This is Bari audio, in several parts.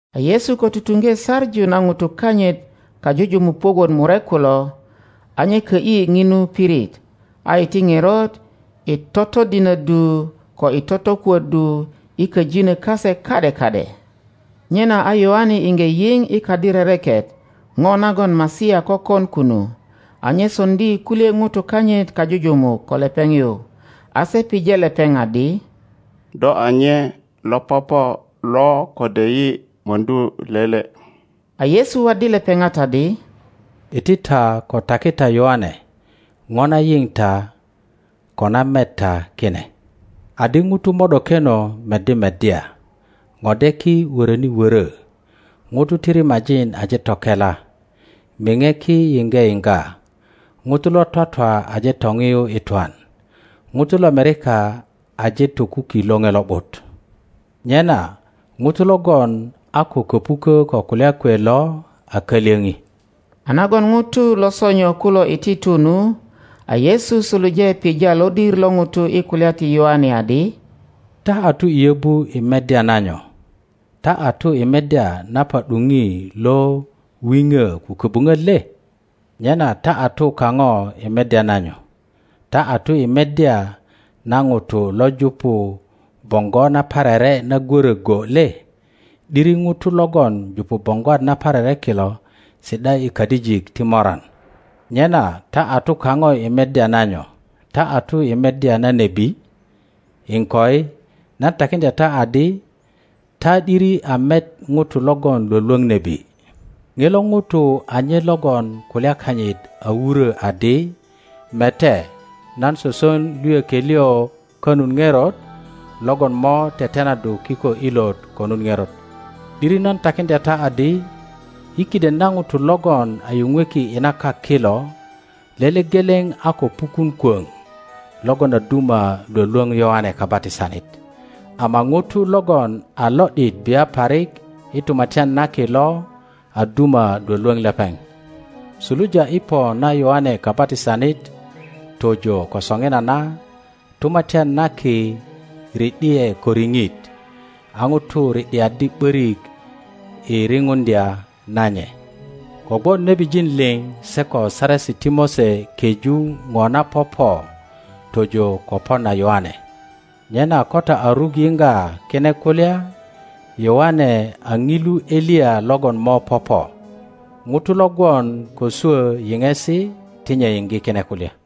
A Yesu ko tutuŋge saŋu na ŋutu kanyit kajujumuk puök wot murek kulo, a nye kö ’yi ŋinu pirit, a iti ŋerot i totodinöddu ko i totokuöddu i köjinö kase ka ’de ka ’de. Nyena a Yoane iŋge yio i kadi rereket ŋo nagon Masia kökon kunu, a nye soŋdi kulye ŋutu kanyit kajujumuk ko lepeŋ yu, a se pije lepeŋ adi, Do a nye lo popo lo kode yi möŋdu lele? A Yesu waddi lepepat adi, Iti ta ko taki ta Yoane po na yio ta ko na met ta kine, adi ŋutu mo ’dokeno meddi meddya, ŋodeki wöröni wörö, ŋutu ti rimajin aje tokela, miŋeki yiŋge yioga, ŋutu lo twatwa aje toŋiyu i twan, ŋutu lomerika aje tokuki Loŋe Lo ’but. Nyena ŋuto logon a ko köpukö ko kulya kwe lo a kalyöŋi. A nagon ŋutu lo sonyo kulo iti tu nu, a Yesu suluje pija lodir lo ŋutu i kulya ti Yoane adi, Ta a tu i yöbu i meddya na nyo? Ta a tu i meddya na pa ’duŋi lo wiŋö ko köbuŋöt le? Nyena ta a tu kaŋo i meddya na nyo? Ta a tu i meddya na ŋuto lo jupu boŋgo naparere na gwöröge? le? ’Diri ŋutu logon jupu boŋgwat naparere kilo si ’da i kadijik ti moran. Nyena ta a tu kaŋo i meddya na nyo? Ta a tu i meddya na nebi? Iŋkoi, nan takiŋdya ta adi ta ’diri a met ŋuto logon Iwolwoŋ nebi. Ŋilo ŋuto a nye logon kulya kanyit a wurö adi, Mete, nan soson luyökie liŋ konut ŋerot logon mo tetenaddu kiko ilot konut ŋerot. ’Diri nan takiŋdya ta adi, i kiden na ŋutu logon a yuŋweki i na kak kilo lele geleŋ a ko pukun kwoŋ logon a duma lwölwöŋ Yoane Kabatisanit; ama ŋuto logon a lo ’dit bia parik i Tumatyan na Ki lo a duma lwölwöŋ lepeŋ. Suluja i pö na Yoane Kabatisanit tojo ko soŋinana. Tumatyan na Ki ri ’di ’e ko riŋit, a ŋutu ri ’diaddi ’börik i riŋuŋdya na nye. Kogwon nebijin liŋ se ko Saresi ti Mose keju ŋo na popo tojo ko po na Yoane; nyena ko ta a ruk yiŋga kine kulya, Yoane a ŋilu Eliya logon mo popo. ŋuto lo gwon ko swö yiŋesi ti nye yiŋge kine kulya.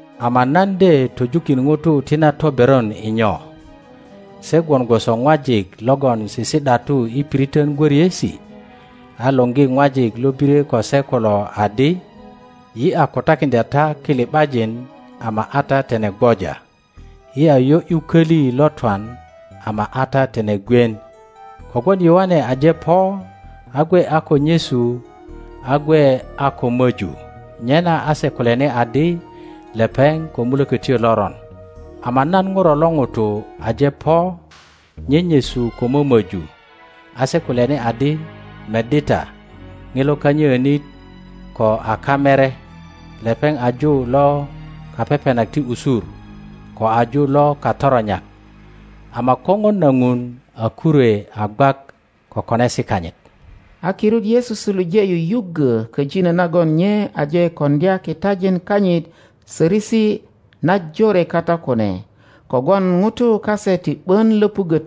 Ama nan de töjukin ŋutu ti na toberon i nyo? Se gwon gwoso ŋwajik logon sisi ’datu i piriton gwöriesi, a luŋgi ŋwajik lo birye ko se kulo adi, Yi a kutakiŋdya ta kili ’bajin, ama a ta tine gwoja, yi a yo ’yu köli lo twan, ama a ta tine gwien. Kogwon Yoane aje po a gwe a ko nyesu a gwe a ko möju, nyena a se kulyani adi, Lepeŋ ko mulökötyo loron;ama nan Ŋuro lo ŋuto aje po nyenyesu ko mömöju, a se kulyani adi, Meddi ta, ŋilo kanyöönit ko a kamere, lepeŋ a ju lo kapepenak ti usur ko a ju lo katoronyak! Ama Koŋon na Ŋun a kurwe a gwak ko konesi kanyit. A kirut Yesu suluje yuyuggö köjino nagon nye aje koŋdya kitajin kanyit sörösi najore kata kune, kogwon ŋutu kase ti ’bön löpuggö töilyet.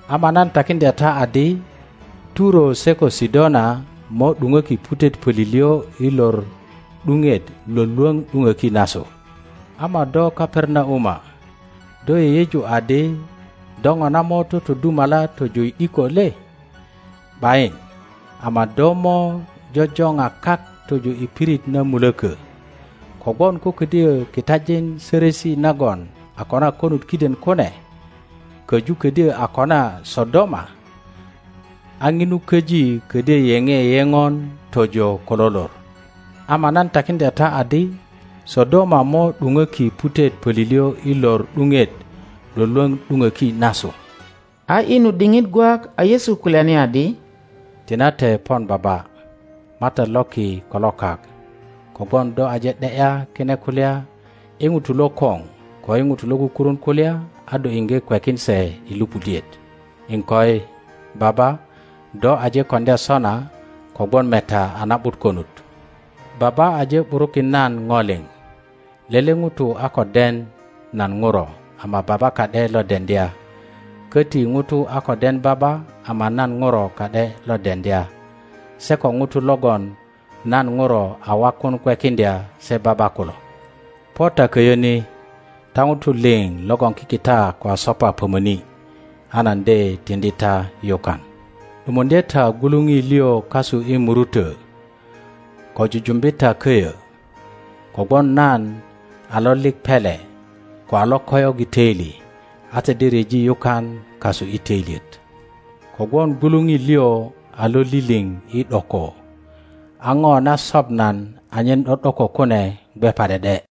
Ama nan takiŋdya ta adi, Turo se ko Sidona mo ’duŋöki putet pölilyö i lor ’duŋet lwölwöŋ ’duŋöki nasu. Ama do Kaperanauma, do yeyeju adi do ŋona mo totodumala tojo i ’diko le? ’Bayin, ama do mo jojoŋa kak tojo i pirit na mulökö. Kogwon ko kodyö kitajin sörösi nagon a kona konut kiden kune köju ködyö a kona Sodoma, a ŋinu köji ködyö yeŋe yeŋon tojo ko lo lor. Ama nan takiŋdya ta adi Sodoma mo ’duŋöki putet pölilyö i lor ’duŋet lwölwöŋ ’duŋöki nasu. A i nu diŋit gwak a Yesu kulyani adi, Tinate pon Baba, MATAT lo ki ko lo kak, kogwon do aje ’de ’ya kine kulya i ŋutu lokoŋ ko i ŋutu lo kukurun kulya, a do iŋge kwekin se i lupudiet; iŋkoi, Baba, do aje koŋdya sona kogwon meta a na ’but konut. Baba aje ’burukin nan ŋo liŋ; lele ŋuto a ko den nan Ŋuro ama Baba ka ’de lo deŋdya; köti ŋuto a ko den Baba ama nan Ŋuro ka ’de lo deŋdya, se ko ŋutu logon nan Ŋuro a wakun kwekiŋdya se Baba kulo. Po ta köyö ni, ta ŋutu liŋ logon kikita ko a sopa pömöni, a nan de tiŋdi ta yukan. ’Dumuŋdye ta gwuluŋi liŋ kasu i murutö ko jujumbi ta köyö, kogwon nan a lolik pele ko a lokoyok i töili, a ta de ryeji yukan kasu i töilyet; kogwon gwuluŋi liŋ a loliliŋ i ’doko, a ŋo na sop nan anyen ’do ’doko kune gwe pa ’de ’de.